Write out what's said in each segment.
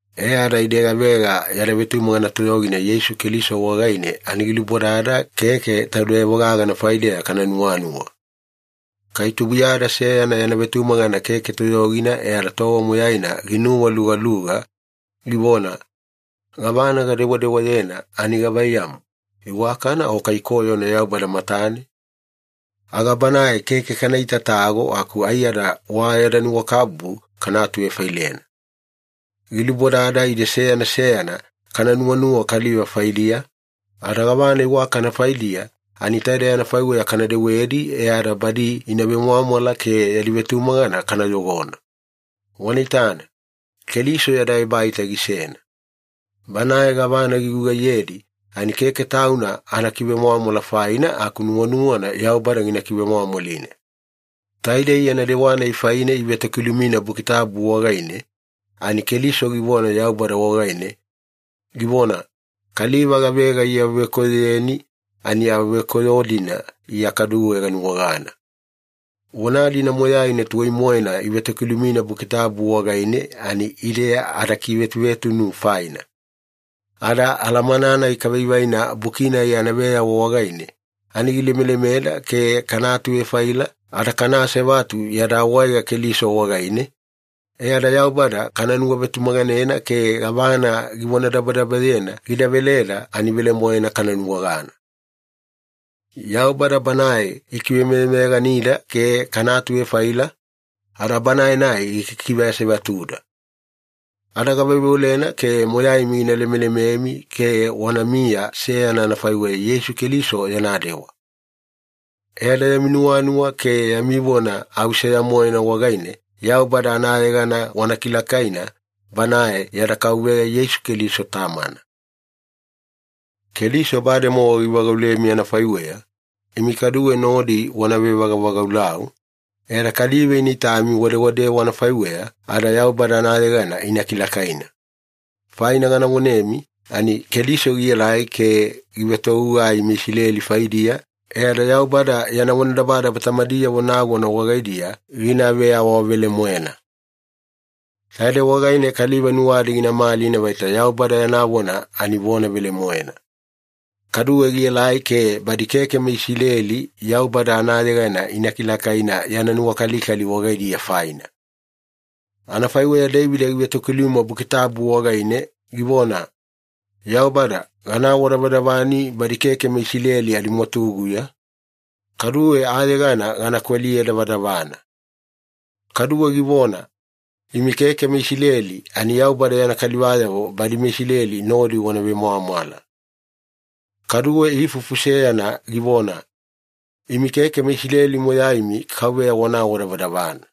E ada ide gavega yada vetumagana toyogina Yeisu Keliso wagaine ani gilubodada keke taudeyavo gagana faideya kana nuwanuwa. Kai tubuiyada seyana yana vetumagana keke toyogina e ada tova moyaina ginuwalugaluga, givona, “Gavana gadewadewayena ani gavaiyamu, iwakana o kai koyona Yaubada matane?” aga banae keke kana itatago aku aiyada wa yada nuwakabubu kana atuvefailena. Gilubodada ide seyana seyana kana nuwanuwa kaliva faidiya, ada gavana iwakana faidiya ani taidei anafaiweya kana dewedi e ada badi ina vemwamwala ke yadi vetumagana kana yogona. Wana itana, Keliso yada ebaita gisena. Banae gavana gigugaiyedi ani keke Tauna anakivemwamwala faina aku nuwanuwana Yaubada gina kivemwamwalina. Taidei yana dewana-nai faine ivetokilumina Buki Tabu wagaine, ani Keliso givona Yaubada wagaine, givona, “Kaliva gavega iawavekoyoyeni ani awavekoyo-dina Iya kaduwe ganuwagana.” Vona-dina moyaina tuwai-moena ivetokilumina Buki Tabu wagaine ani ide adakivetuvetunu faina. Ada alamana-nai kavaivaina Buki-nai anaveyawa wagaine, ani gilemelemeda ke kana atuvefaila ada kana asevatu yada awaega Keliso wagaine, e ada Yaubada kana nuwavetumaganena ke gavana givonadabadabayena gida veleda ani velemoena kana nuwagana. Yaubada Banae gikivemeyameyaganida ke kana atuvefaila, ada Banae-nai gikikiveasevatuda. Ada gaveoveolena ke moyaimi gina lemelememi ke wanamiya seyana anafaiweya Yeisu Keliso yana dewa. E ada yami nuwanuwa ke yami vona au seya-moena wagaine Yaubada anayegana wana kilakaina, Banae yada Kauveya Yeisu Keliso Tamana. Keliso bademowa givagaulemi anafaiweya, imi kaduwe nodi wana vevagavagaulau, e ada kaliva ina itami wadewadewa anafaiweya ada Yaubada anayegana ina kilakaina. Faina gana vonemi ani Keliso gielai ke givetogugai meIsileli faidiya e ada Yaubada yana vonadabadaba tamadiyavo nagona wagaidiya gina veawavelemoena. Taidei wagaine kaliva nuwadi gina malina vaita Yaubada yana vona ani vona velemoena. Kaduwe gielai ke badi keke meIsileli Yaubada anayegana ina kilakaina yana nuwakalikali wagaidiya faina. Anafaiweya Deivida givetokiluma Buki Tabu wagaine, givona, “Yaubada, gana awadavadavani badi keke meIsileli adimwatuguya, kaduwe ayegana gana kweliye davadavana.” Kaduwe givona, “Imi keke meIsileli ani Yaubada yana kalivayavo badi meIsileli nodi wana vemwamwala.” Kaduwe ifufu seyana givona, “Imi keke meIsileli moyaimi KAUVEYA wana awadavadavana.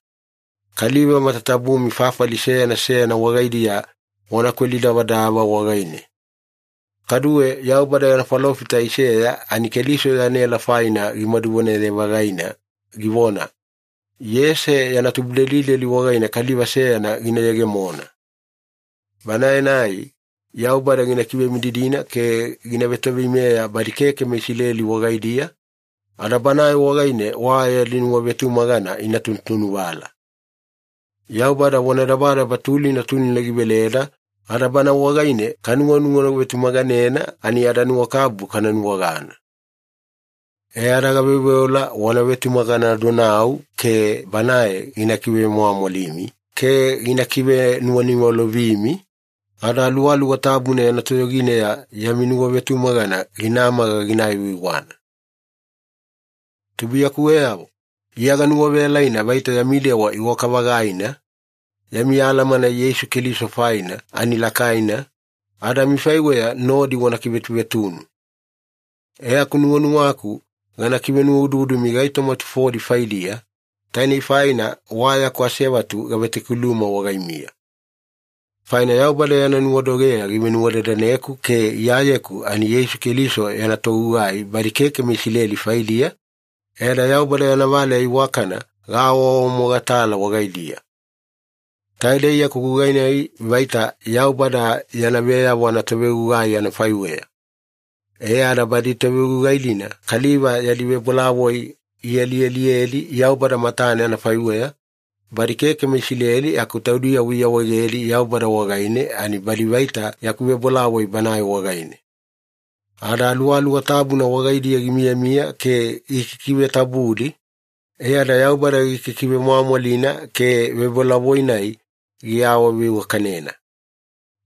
Kaliva matatabumi fafali seyana seyana wagaidiya wana kweli davadava wagaine.” Kaduwe Yaubada yana falofita Aiseya ani Keliso yana ela faina gimaduvonaye-vagaina givona, “Iyese yana tubudelideli wagaine Kaliva seyana gina yegemona. Banae-nai Yaubada gina kivemididina ke gina vetoveimeya badi keke meIsileli wagaidiya, ada Banae wagaine wa yadi nuwavetumagana ina tunutunuvala.” Yaubada vonadabadaba tulina tulina giveleda ada Bana wagaine kanuwanuwavetumaganena ani adanuwakabubu kana nuwagana. E ada gaveoveola wana vetumaganadonau ke Banae gina kivemwamwalimi ke gina kivenuwaniwalovimi, ada Aluwaluwa Tabuna yana toyogineya yami nuwavetumagana ginamaga gina aiwaiwana. Tubuiyakuweyavo, Iya ganuwaveyalaina vaita yami dewa iwaka-vagaina, yami alamana Yeisu Keliso faina ani lakaina, ada amifaiweya nodi wana vekivetuvetunu. E aku nuwanuwaku gana kivenuwaududumi gaitoma tufodi faidiya, tainei faina wa yaku asevatu gavetokiluma wagaimiya. Faina Yaubada yana nuwadogeya givenuwadadaneku ke Iyayeku ani Yeisu Keliso yana togugai badi keke meIsileli faidiya, e ada Yaubada yana valeya iwakana gaawaawamogatala wagaidiya. Taidei yaku gugai-nai vaita Yaubada yana veyavo anatovegugai anafaiweya, e ada badi tovegugai-dina kaliva yadi vebolavoi ialialiyedi Yaubada matane anafaiweya, badi keke meIsileli aku taudiyavo iawaegedi Yaubada wagaine ani badi vaita yaku vebolavoi Banae wagaine. Ada Aluwaluwa Tabuna wagaidiya gimiyamiya ke gikikivetabudi, e ada Yaubada gikikivemwamwalina ke vebolavoi-nai giawaveiwakanena.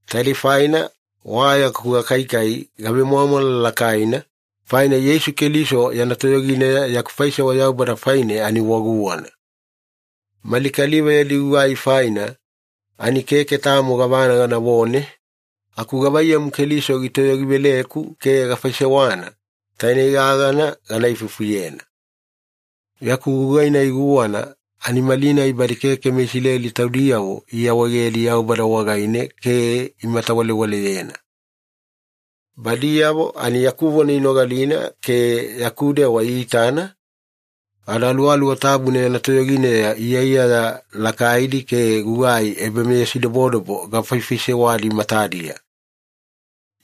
Taidei faina wa yaku gakaikai gavemwamwala lakaina, faina Yeisu Keliso yana toyogineya yaku faisewa Yaubada faine ani wa guwana. Mali kaliva yadi gugai faina ani keke tamo gavana ganavone, aku gavaiyamu Keliso gitoyogiveleku ke gafaisewana, tainei gagana gana ifufuyena. Yaku gugai-nai guwana ani malinai badi keke meIsileli taudiyavo iawaegedi Yaubada wagaine ke imatawalewaleyena. Badiyavo ani yaku vona inogalina ke yaku dewa iitana, ada Aluwaluwa Tabuna yana toyogineya iyaiyaya lakaidi ke gugai ebameyasidobodobo gafaifaisewadi matadiya.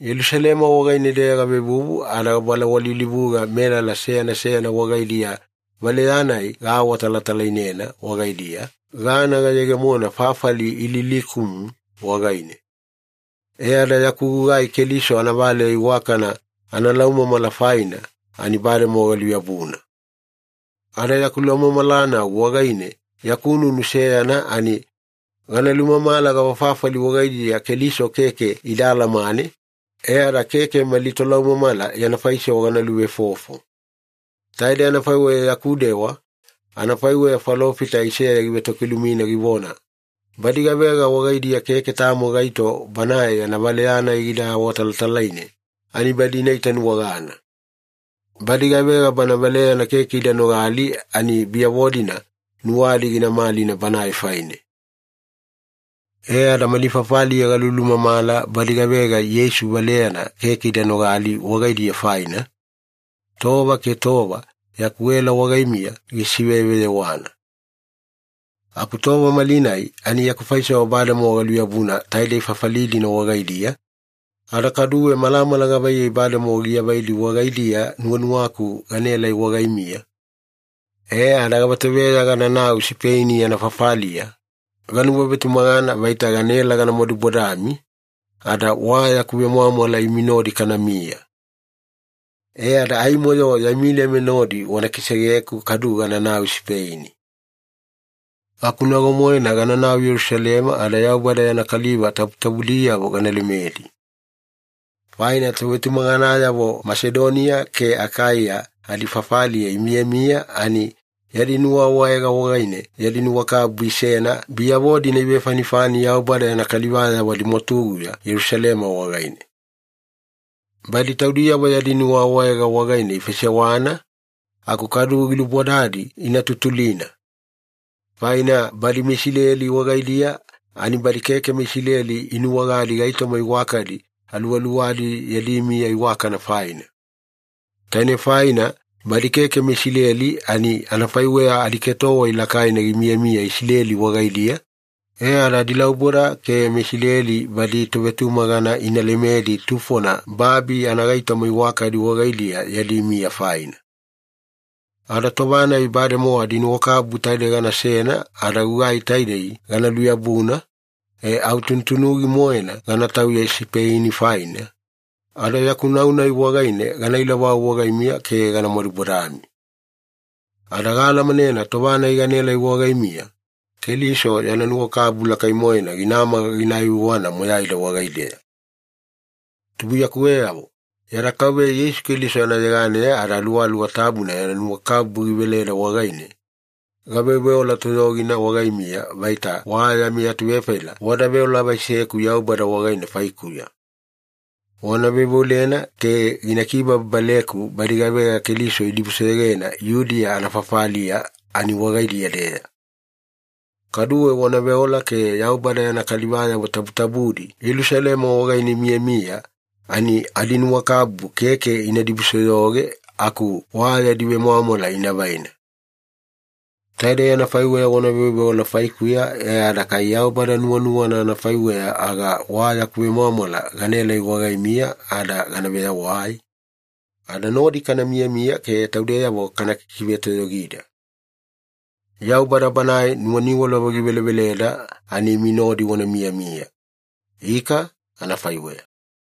Yelusalema wagaine-deya gavevuvu ada gabalawalilivuga melala seyana seyana wagaidiya valeyana-nai gaawatalatalainena wagaidiya, gana gayegemona fafali Ililikumu wagaine. E ada yaku gugai Keliso anavaleya iwakana analaumamala faina ani bademowa galuyabuna. Ada yaku laumamalanau wagaine yaku nunu seyana ani, gana lumamala gavafafali wagaidiya Keliso keke ida alamane, e ada keke mali tolaumamala yana faisewa gana luvefofo. Taidei anafaiweya yaku dewa, anafaiweya falofita Aiseya givetokilumina, givona, “Badi gavega wagaidiya keke tamo gaito Banae yana valeya-nai gida awatalatalaine, ani badi ina itanuwagana. Badi gavega Bana valeyana keke ida nogali ani biyavo-dina nuwadi gina malina Banae faine.” E ada mali fafaliya galulumamala badi gavega Yeisu valeyana keke ida nogali wagaidiya faina, tova ke tova yaku ela wagaimiya gisiveyeveyewana. Aku tova malinai ani yaku faisewa bademowa galuyabuna taidei fafali-dina wagaidiya, ada kaduwe malamala gavaiyei bademowa giavaidi wagaidiya nuwanuwaku ganaelai wagaimiya, e ada gavatoveya gananau Sipeini anafafaliya, ganuwavetumagana vaita ganaela gana madubodami, ada wa yaku vemwamwala imi nodi kanamiya. E ada aimo-yo yami lema nodi wana kisegeku kadu gananau Sipeini. Aku nago-moena gananau Yelusalema ada Yaubada yana kaliva tabutabudiyavo gana lemedi. Faina tovetumaganayavo Masedoniya ke Akaiya adifafaliya imiyamiya ani yadi nuwaawaega wagaine yadi nuwakabubu isena biyavo-dina ivefanifani Yaubada yana kalivayavo adimwatuguya Yelusalema wagaine. Badi taudiyavo yadi nuwaawaega wagaine ifaisewana, aku kaduwe gilubodadi ina tutulina. Faina badi meIsileli wagaidiya ani badi keke meIsileli inuwagadi gaitoma iwakadi aluwaluwadi yadi miya iwakana faina. Taine faina badi keke meIsileli ani anafaiweya adiketowai lakaina gimiyamiya Isileli wagaidiya, e ada adilauboda ke meIsileli badi tovetumagana ina lemedi tufona babi anagaitoma iwakadi wagaidiya yadi miya faina. Ada tova-nai bademowa adinuwakabubu taide ganasena ada gugai taidei gana luyabuna, e au tunutunugi-moena gana tauya Sipeini faina, ada yaku nau-nai wagaine gana ilovau wagaimiya ke gana madubodami. Ada gaalamanena tova-nai ganaelai wagaimiya, Keliso yana nuwakabubu lakai-moena ginamaga gina aiwaiwana moyaida wagaideya. Tubuiyakuweyavo, yada Kauveya Yeisu Keliso anayeganeya ada Aluwaluwa Tabuna yana nuwakabubu giveleda wagaine, gaveoveola toyogina wagaimiya vaita wa yami atuvefaila wada veolavaiseku Yaubada wagaine faikuya. Wana veoveolena ke gina kibababaleku badi gavega Keliso idibusoyogena Yudiya anafafaliya ani wagaidiya-deya. Kaduwe wana veola ke Yaubada yana kalivayavo tabutabudi Yelusalema wagaine imiyamiya ani adinuwakabubu keke ina dibusoyoge aku wa yadi vemwamwala ina vaina. Taidei anafaiweya wana veoveola faikuya e ada kai Yaubada nuwanuwana anafaiweya, aga wa yaku vemwamwala ganaelai wagaimiya ada gana veyawai, ada nodi kana miyamiya ke taudeyavo kana kikivetoyogida. Yaubada Banae nuwaniwalova giveleveleda ani imi nodi wana miyamiya. Ika, anafaiweya.